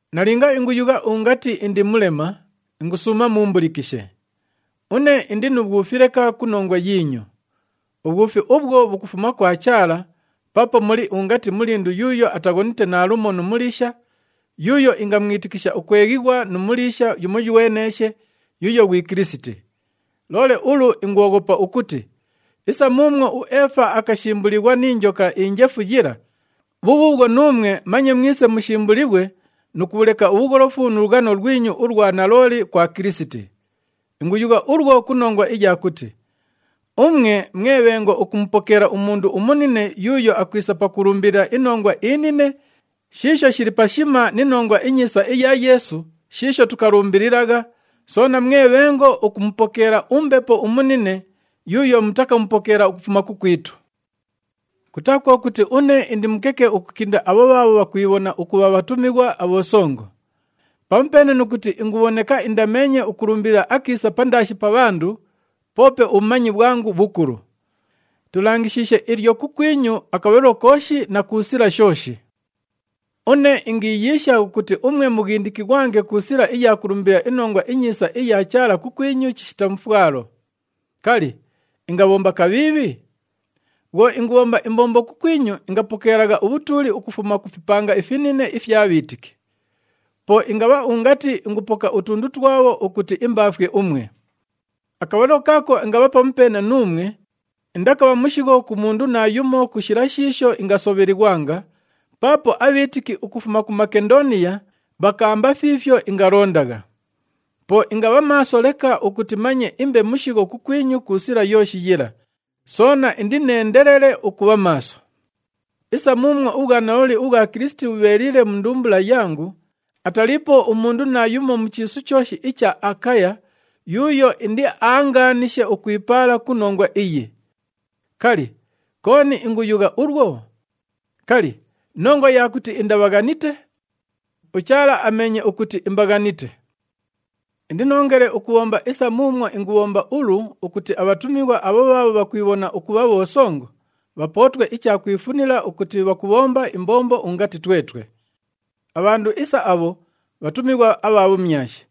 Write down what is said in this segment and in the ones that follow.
Nalinga inguyugha ungati indi mulema, ingusuuma muumbulikishe. Une indi nu bhwufi leka ku nongwa yiinyu. Ubhwufi ubhwo bhukufuma kwa Chaala paapo muli ungati mulindu yuuyo ataghonite naalumo nu muliisha, yuuyo ingamwitikisha ukweghighwa nu muliisha yumoyweneeshe, yuuyo ghwi Kilisiti. Loole ulu ingwoghopa ukuti, isa muumwo uEefa akashimbulighwa ni njoka injefu yila, bhubhuubhwo nuumwe manye mwise mushimbulighwe nu kubhuleka ubhugholofu nu lughano lwinyu ulwa nalooli kwa Kilisiti. Inguyugha ulwo ku nongwa iya kuti umwe mwe bhengo ukumupokeela umundu umunine yuuyo akwisa pakulumbilila inongwa inine shiisho shili pashima ni Nongwa iNyiisa isha Yeesu shiisho tukalumbililagha, soona mwe bhengo ukumupokeela umbepo umunine yuuyo mutakamupokeela ukufuma kukwitu. Kutaa kwo kuti une indi mukeke ukukinda abho bhaabho bhakwibhona ukubha, “Bhatumighwa abhosongo.” Pamupeene nu kuti ingubhoneka indameenye ukulumbilila akiisa pandaashi pa bhandu, poope ubhumanyi bhwangu bhukulu. Tulangishiishe ilyo kukwinyu akabhalilo kooshi na ku sila shooshi. Une ingiiyiisha ukuti umwe mughindikighwange ku sila iya kulumbilila iNongwa iNyiisa iya Chaala kukwinyu chishita mufwalo. Kali, ingabhomba kabhiibhi? Bhwo ingubhomba imbombo kukwinyu, ingapokeelagha ubhutuuli ukufuma ku fipanga ifinine ifya bhiitiki. Po ingabha ungati ingupoka utundu twabho ukuti imbaafwe umwe. Akabhalilo kaako ingabha pamupeene nuumwe, indakabha mushigho ku mundu naayumo ku shila shiisho ingasobhelighwanga, paapo abhiitiki ukufuma ku Makendooniya bhakaamba fiifyo ingalondagha. Po ingabha maaso leka ukuti manye imbe mushigho kukwinyu ku sila yooshi yila, soona indineendelele ukubha maaso. Isa muumwo ubhwanalooli ubhwa Kilisiti bhubheeliile mu ndumbula yangu, ataliipo umundu naayumo mu chiisu chooshi icha Akaya yuuyo indiaangaanishe ukwipaala ku nongwa iyi. Kali, kooni inguyugha ulwo? Kali, nongwa iya kuti indabhaghanite? UChaala ameenye ukuti imbaghanite. Indinoongele ukubhomba isa muumwo ingubhomba ulu ukuti abhatumighwa abho bhaabho bhakwibhona ukubha bhosongo, bhapootwe icha kwifunila ukuti bhakubhomba imbombo ungati twetwe. Abhandu isa abho bhatumighwa abha bhumyashi.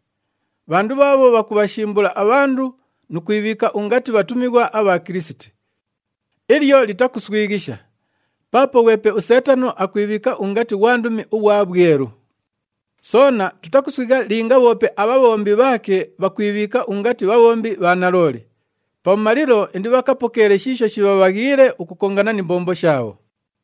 Bhandu bhaabho bhakubhashimbula abhandu nu kwibhiika ungati bhatumighwa abha Kilisiti. Ilyo litakuswighisha! Paapo ghwepe uSeetano akwibhiika ungati ghwandumi ughwa bhwelu. Soona tutakuswigha linga bhoope abhabhombi bhaake bhakwibhiika ungati bhabhombi bha nalooli. Pabhumalilo indibhakapokeele shiisho shibhabhaghiile ukukongana ni mbombo shaabho.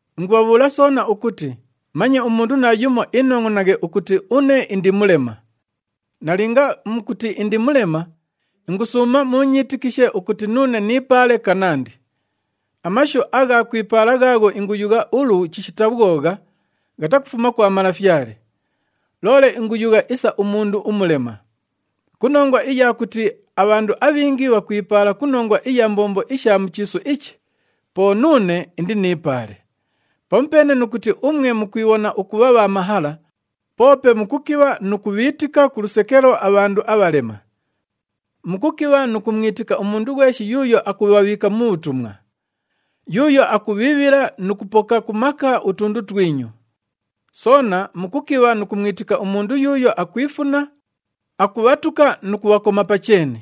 Ingubhabhuula soona ukuti manye umundu naayumo inongʼonaghe ukuti une indi mulema! Nalinga mukuti indi mulema, ingusuuma muunyiitikishe ukuti nuune niipaale kanandi. Amashu agha kwipaala ghaagho inguyugha ulu chishita bhwogha, ghatakufuma kwa Malafyale, loole inguyugha isa umundu umulema. Ku nongwa iya kuti abhandu abhingi bhakwipaala ku nongwa iya mbombo isha mu chiisu ichi, po nuune indiniipaale. Pamupeene nu kuti umwe mukwibhona ukubha bha mahala, poope mukukibha nu kubhiitika ku lusekelo abhandu abhalema! Mukukibha nu kumwitika umundu ghweshi yuuyo akubhabhiika mu bhutumwa! Yuuyo akubhiibhila nu kupoka ku maka utundu twinyu! Soona mukukibha nu kumwitika umundu yuuyo akwifuna, akubhatuka nu kubhakoma pa cheeni!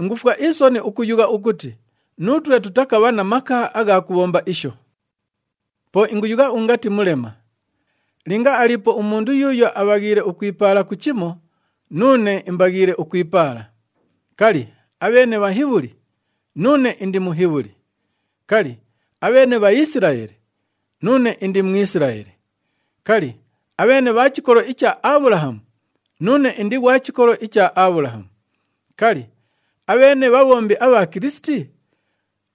Ingufwa isoni ukuyugha ukuti nuutwe tutakabha na maka agha kubhomba isho! Po inguyugha ungati mulema! Linga aliipo umundu yuuyo abhaghiile ukwipaala ku chimo, nuune imbaghiile ukwipaala. Kali, abheene Bhahibhuli? Nuune indi Muhibhuli. Kali, abheene Bhaisilaeli? Nuune indi Mwisilaeli. Kali, abheene bha chikolo icha Abhulahamu? Nuune indi ghwa chikolo icha Abhulahamu. Kali, abheene bhabhombi abha Kilisiti?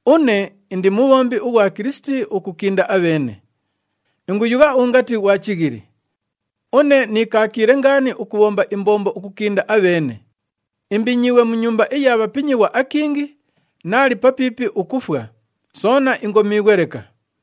Une indi mubhombi ughwa Kilisiti ukukinda abheene. Inguyugha ungati ghwa chighili! Une niikaakiile ngaani ukubhomba imbombo ukukinda abheene, imbinyiighwe mu nyumba iya bhapinyighwa akingi, naali papiipi ukufwa, soona ingomiighwe leka.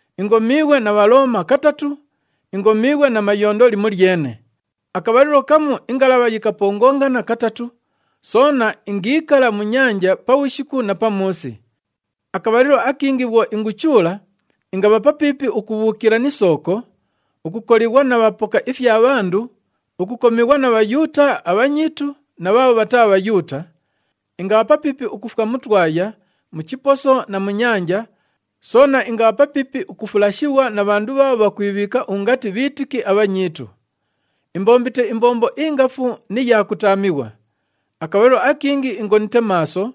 Ingomiighwe na Bhalooma katatu, ingomiighwe na mayondo limolyene, akabhalilo kamu ingalabha yikapongongana katatu, soona ingiikala mu nyanja pabhushiku na pamuusi. Akabhalilo akingi bhwo inguchuula, ingabha papiipi ukubhuukila ni sooko, ukukolighwa na bhapoka ifya bhandu, ukukomighwa na Bhayuuta abhanyiitu na bhaabho bhataa Bhayuuta. Ingabha papiipi ukufwa mu twaya, mu chiposo na mu nyanja, soona ingabha papiipi ukufulashighwa na bhandu bhaabho bhakwibhiika ungati bhiitiki abhanyiitu. Imbombite imbombo ingafu ni ya kutaamighwa. Akabhalilo akingi ingonite maaso,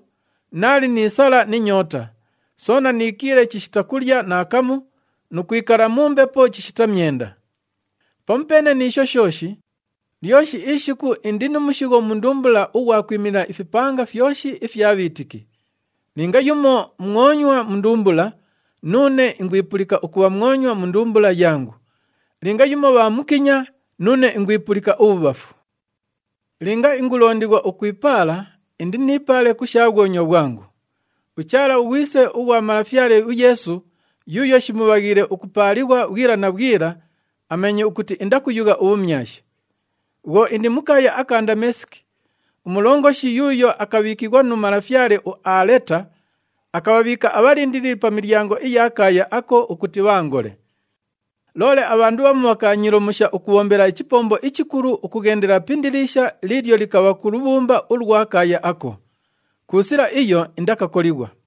naali ni sala ni nyoota, soona niikiile chishita kulya naakamu nu kwikala mu mbepo chishita myenda. Pamupeene ni isho shooshi, lyoshi ishiku indi nu mushigho mu ndumbula ughwa kwimilila ifipanga fyoshi ifya bhiitiki. Linga yumo mwonywa mu ndumbula, nuune ingwipulika ukubha mwonywa mu ndumbula yangu. Linga yumo bhaamukinya, nuune ingwipulika ubhubhafu. Linga ingulondighwa ukwipaala, indiniipaale ku sha bhwonywa bhwangu. UChaala, uGhwise ughwa Malafyale uYeesu, yuuyo shimubhaghiile ukupaalighwa bhwila na bhwila, ameenye ukuti indakuyugha ubhumyashi. Bhwo indi mu kaaya aka Ndameesiki, umulongoshi yuuyo akabhiikighwa nu malafyale uAaleta, akabhabhiika abhalindilili pa milyango iya kaaya ako ukuti bhaangole. Loole abhandu bhamu bhakaanyiilomusha ukubhombela ichipombo ichikulu ukughendela pi indiliisha liilyo likabha ku lubhumba ulwa kaaya ako. Ku sila iyo indakakolighwa.